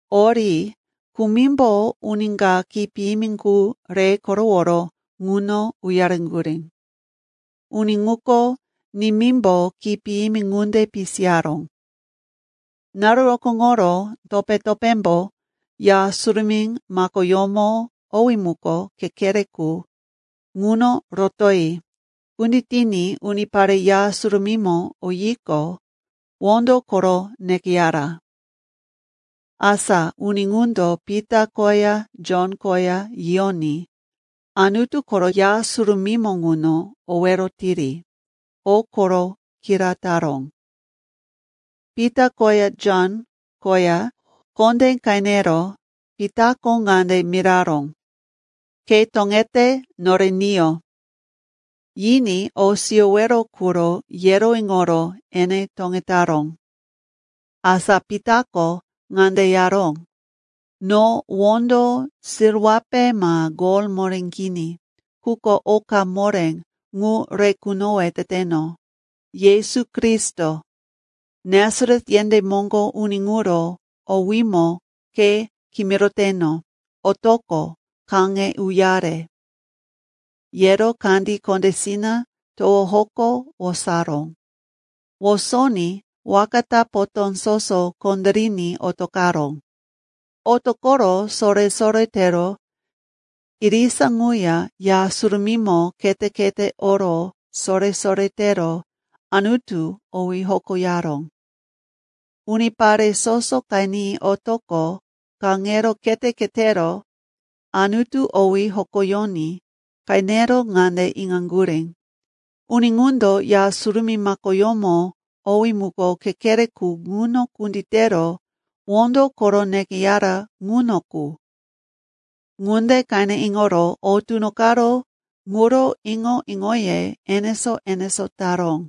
Ori kumimbo uni ka khí piyimi qu re koroworo ŋuno uyareŋgurí. Uni ŋuko, nimímbo khí piyimi ŋunde pisiyaró. Naru rokóŋoro topé-topémbo Ya Surumí makoyómo owí muko Kekere Qu ŋuno rotoyi kunditiní unipare Ya Surumímo oyiqo, wondo koro nekeyara. Asa uni ŋundo Pita koya Jon koya yiyoní Anutu koro Ya Surumímo ŋuno owero tiri, o koro kira taró. Pita koya Jon koya kondé qenero Pitako ŋande miraró, “Ke toŋete nore niyo.” Yiní o siyowero quro yero iŋoro ene toŋetaró. Asa Pitako ŋande yaró, “No wondo silwape ma gol moré kini. Quko oka moré, ŋu re kunowe teteno. Yesu Kristo, Nasaret yendé moŋgo uni ŋuro owímo ke kimiroteno, otoqo kaŋe uyare.” Yero kandí kondésina towo hoko wosaró. Wosoní waka ta potó soso kondériní otoqaró. Otoqoro sore-sore tero irisa ŋuya Ya Surumímo khete-khete oro sore-sore tero Anutu owí hokoyaró. Unipare soso qeni otoqo kaŋero khete-khetero Anutu owí hokoyoní qenero ŋande iŋaŋgurí, uni ŋundo Ya Surumí makoyómo owí muko Kekere Qu ŋuno kunditero wondo koro nekeyara ŋuno qu. Ŋunde qene iŋoro o tunoqaró ŋuro iŋo-iŋoye enesó-enesó taró.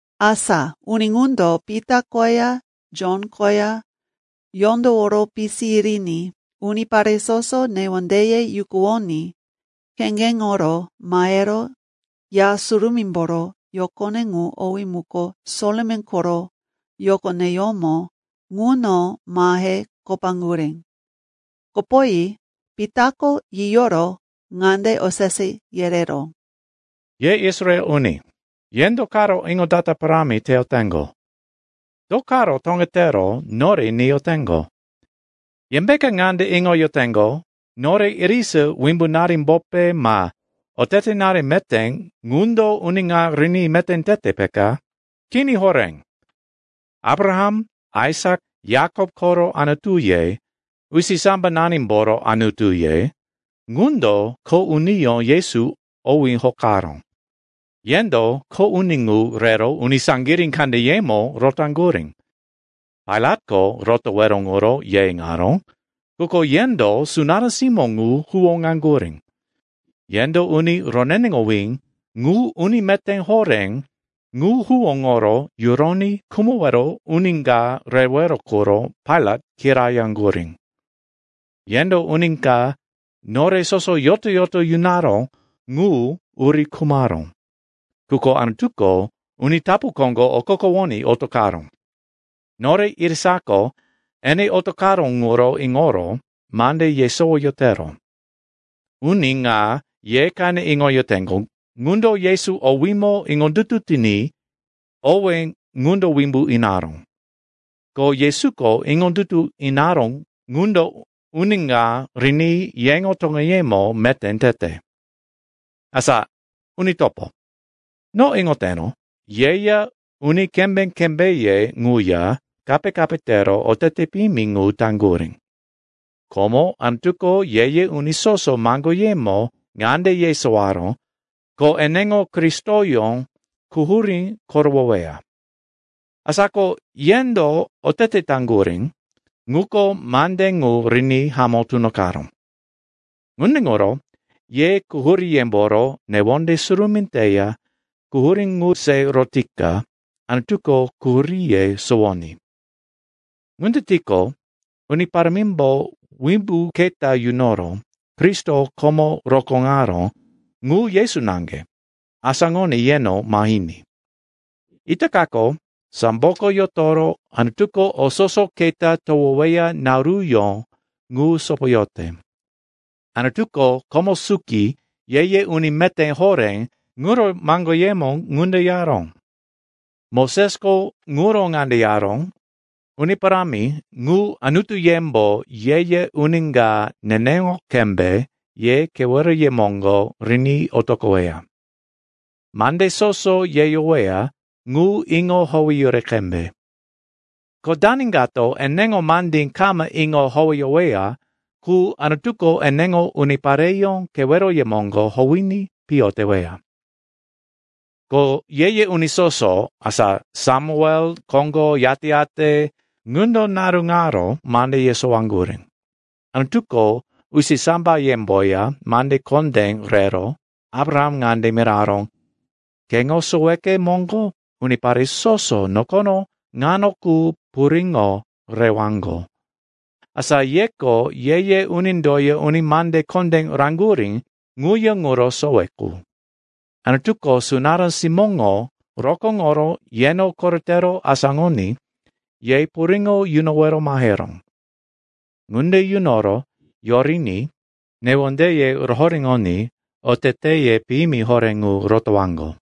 Asa uni ŋundo Pita koya Jon koya yondoworo pisi yiriní unipare soso newondeye yukuwoní kheŋgeŋoro mahero Ya Surumímboro yokone ŋu owí muko Solomon koro Yokoneyómo ŋuno mahe kopaŋgurí. Kopoyi Pitako yiyoro ŋande osese yereró, “Ye Israel uni, ye do karo iŋondata parámi teyoteŋgo? Do karo toŋetero nore niyoteŋgo? Yembeka ŋande iŋoyoteŋgo, nore irisa wimbunarimbope ma otetenari meté ŋundo uni ŋa riní meté tete, peka? Kini horé! Abraham, Aisak, Yakop koro Anutuye, usisambananimboro Anutuye, ŋundo kho uniyó Yesu owí hokaró. Yendo kho uni ŋu rero uni saŋgirí kandeyemo rotaŋgurí. Pailatko rotowero ŋuro ye iŋaró, quko yendo sunará simó ŋu huwóŋaŋgurí. Yendo uni roneneŋowí ŋu, uni meté horé ŋu huwóŋoro yuroní khumowero uni ka rewero quro Pailat kirayaŋgurí. Yendo uni ka nore soso yoto-yoto yunaró ŋu uri khumaró, quko Anutuko uni tapu koŋgo okokowoní otoqaró. Nore irisako ene otoqaró ŋuro iŋoro mande yesowoyotero. Uni ŋa ye qene iŋoyoteŋgo, ŋundo Yesu owímo iŋondutu tiní owé ŋundo wimbu inaró. Ko Yesuko iŋondutu inaró ŋundo uni ŋa riní yeŋo toŋeyemo meté tete. “Asa, uni topo, no iŋoteno, yeya uni kembé-kembéye ŋuya kape-kape tero otete piyimi ŋu taŋgurí. Komo Anutuko ye-ye uni soso maŋgoyemo ŋande yesowaró, ko eneŋo Kristoyó quhurí korowoweya. Asa ko yendo otete taŋgurí, ŋuko mande ŋu riní hamó tunoqaró. Ŋunde ŋuro ye quhuríyemboro newonde surumí teya quhurí ŋu se rotika Anutuko quhuríye sowoní. Ŋunde tiqo, Uni Parámimbo wimbu keta yunoro Kristo komo rokóŋaró ŋu, Yesu naŋge, asáŋoní yeno mahiní. Itakako samboko yotoro Anutuko o soso keta towoweya naruyó ŋu sopoyote. Anutuko komo suki ye-ye uni meté horé ŋuro maŋgoyemo ŋunde yaró. Mosesko ŋuro ŋande yaró, ‘Uni Parámi ŋu, Anutuyembo ye-ye uni ka neneŋo qembe ye keweroye moŋgo riní otoqoweya. Mande soso yeyoweya ŋu iŋo howeyuri qembe. Ko dani kato eneŋo mandí kama iŋo howeyoweya qu, Anutuko eneŋo unipareyó keweroye moŋgo howiní piyo teweya.’ “Ko ye-ye uni soso, asa Samuel koŋgo yate-yate, ŋundo naru ŋaro mande yesowaŋgurí. Anutuko usisambayemboya mande kondé rero Abraham ŋande miraró, ‘Keŋo soweke moŋgo unipare soso nokono ŋano qu puriŋo rewaŋgo.’ Asa yeko ye-ye unindoya uni mande kondé raŋgurí ŋuya ŋuro sowe qu. Anutuko sunará simóŋo rokóŋoro yeno koretero asáŋoní ye puriŋo yunowero maheró. Ŋunde yunoro yoriní newondeye rohoréŋoní oteteye piyimi horé ŋu rotowaŋgo.”